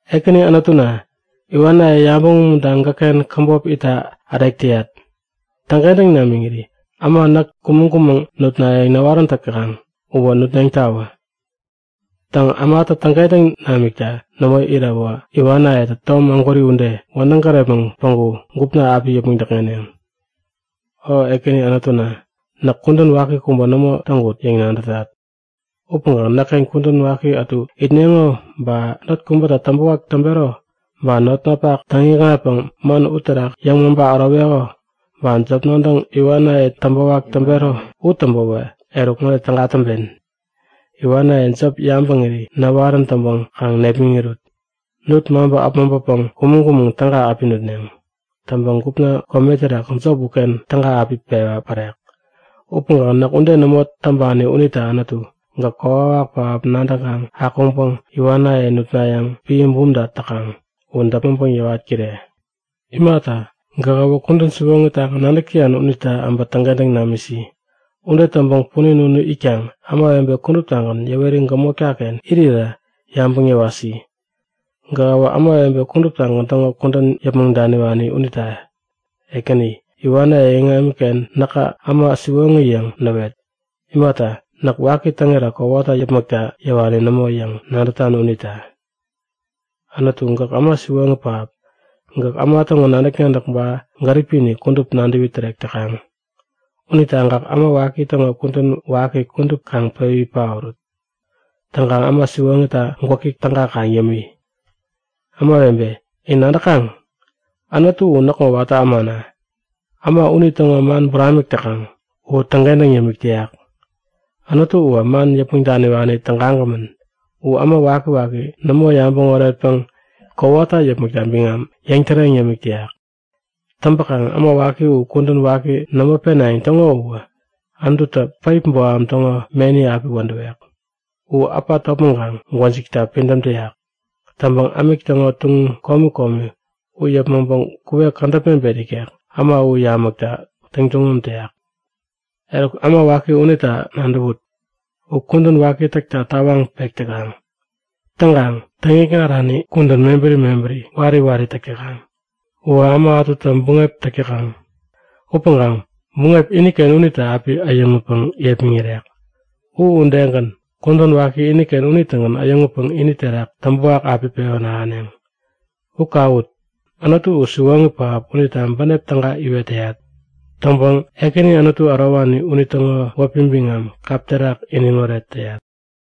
Ekäni Anutuna, iwanaye yabäŋ umuntaŋ gäkken käbop itta ärek täyat. Täŋkentäŋ namiŋiri äma näk kumäŋ-kumäŋ nutnayäŋ näwarän täkaŋ uwä nutneŋtawä. Täŋ ämatä täŋkentäŋ namikta nämo iräwä, iwanayetä tom ägwäri ude wädäŋ gärepmäŋ päŋku gupna api yäpmäŋ däkŋeneŋ. O Ekäni Anutuna, näk kudän waki kubä nämo täŋkut yäŋ nadätat. Upäŋkaŋ näkken kudän waki ätu itneŋo, ba not kubäta täŋpäwak täŋpero, ba notnapak täŋ-ikŋatpäŋ man uterak yäŋmaŋpa äroweko, ba jop nadäŋ iwanaye täŋpäwak täŋpero u täŋpäwä, eruk ŋode täga täŋpen; Iwanaye jop yabäŋiri näwarän täŋpäŋ kaŋ nepmäŋirut! Nut-maŋpä äpmoŋpapäŋ kumäŋ-kumäŋ täga api nutneŋ. Täŋpäŋ gupna kome terak jop uken täga api pewä pärek. Upäŋkaŋ näk ude nämo täŋpani unita Anutu, gäk kokwawak pähap nadäŋkaŋ akuŋpäŋ iwanaye nutnayäŋ piä bumta täkaŋ u däpmäŋpäŋ yäwat-kire! Imata, gäkäwä kudän siwoŋitagän nadäk täyan unita äbä täŋkentäŋ namisi. Ude täŋpäŋ punin unu itkaŋ ämawebe kuduptagän yäweri gämotkaken irirä yabäŋ yäwasi. Gähäwä ämawebe kuduptagän täŋo kudän yäpmäŋ daniwani unita Ekäni, iwanaye iŋamiken näka äma siwoŋi yäŋ näwet! Imata, näk waki täŋira kowata yäpmäkta yäwani nämo yäŋ nadätan unita. Anutu, gäk äma siwoŋi pähap. Gäk äma täŋo nadäk-nadäk ba gäripini kudup nadäwi tärek täkaŋ. Unita gäk äma waki täŋo kudän waki kudup kaŋ pewi paorut. Täŋkaŋ äma siwoŋita gwäki täga kaŋ yämi. Ämawebe, in nadäkaŋ? Anutu u näkŋo watä ämana. Äma unitäŋo man buramik täkaŋ u täŋkentäŋ yämik täyak. Anutu uwä man yäpmäŋ daniwani tägagämän. U äma wakiwaki nämo yabäŋ oretpäŋ kowata yäpmäkta biŋam yäŋtäreŋ yämik täyak. Täŋpäkaŋ äma waki u kudän waki nämo penayäŋ täŋo uwä Anututä päip boham täŋo meni api wädäwek. U äpa topmäŋkaŋ gwäjikta pidäm täyak. Täŋpäŋ ämik täŋo tuŋum komi komi u yäpmäŋpäŋ kuwek kädäp mebet ikek äma u yamäkta täŋtuŋum täyak. Eruk, äma waki unita nadäwut. U kudän waki täkta tawaŋ pek täkaŋ. Täŋkaŋ täŋikŋarani kudän mebäri mebäri wari wari täk täkaŋ. Uwä äma ätuta buŋep täk täkaŋ. Upäŋkaŋ buŋep iniken unitä api äyäŋutpäŋ yepmäŋirek. U udegän, kudän waki iniken unitägän äyäŋutpäŋ ini terak täŋpäwak api pewän ahäneŋ. U kawut! Anutu u siwoŋi pähap unita bänep täga iwet täyat. Täŋpäŋ Ekäni Anutu ärowani unitäŋo wäpi biŋam kap terak iniŋoret täyat.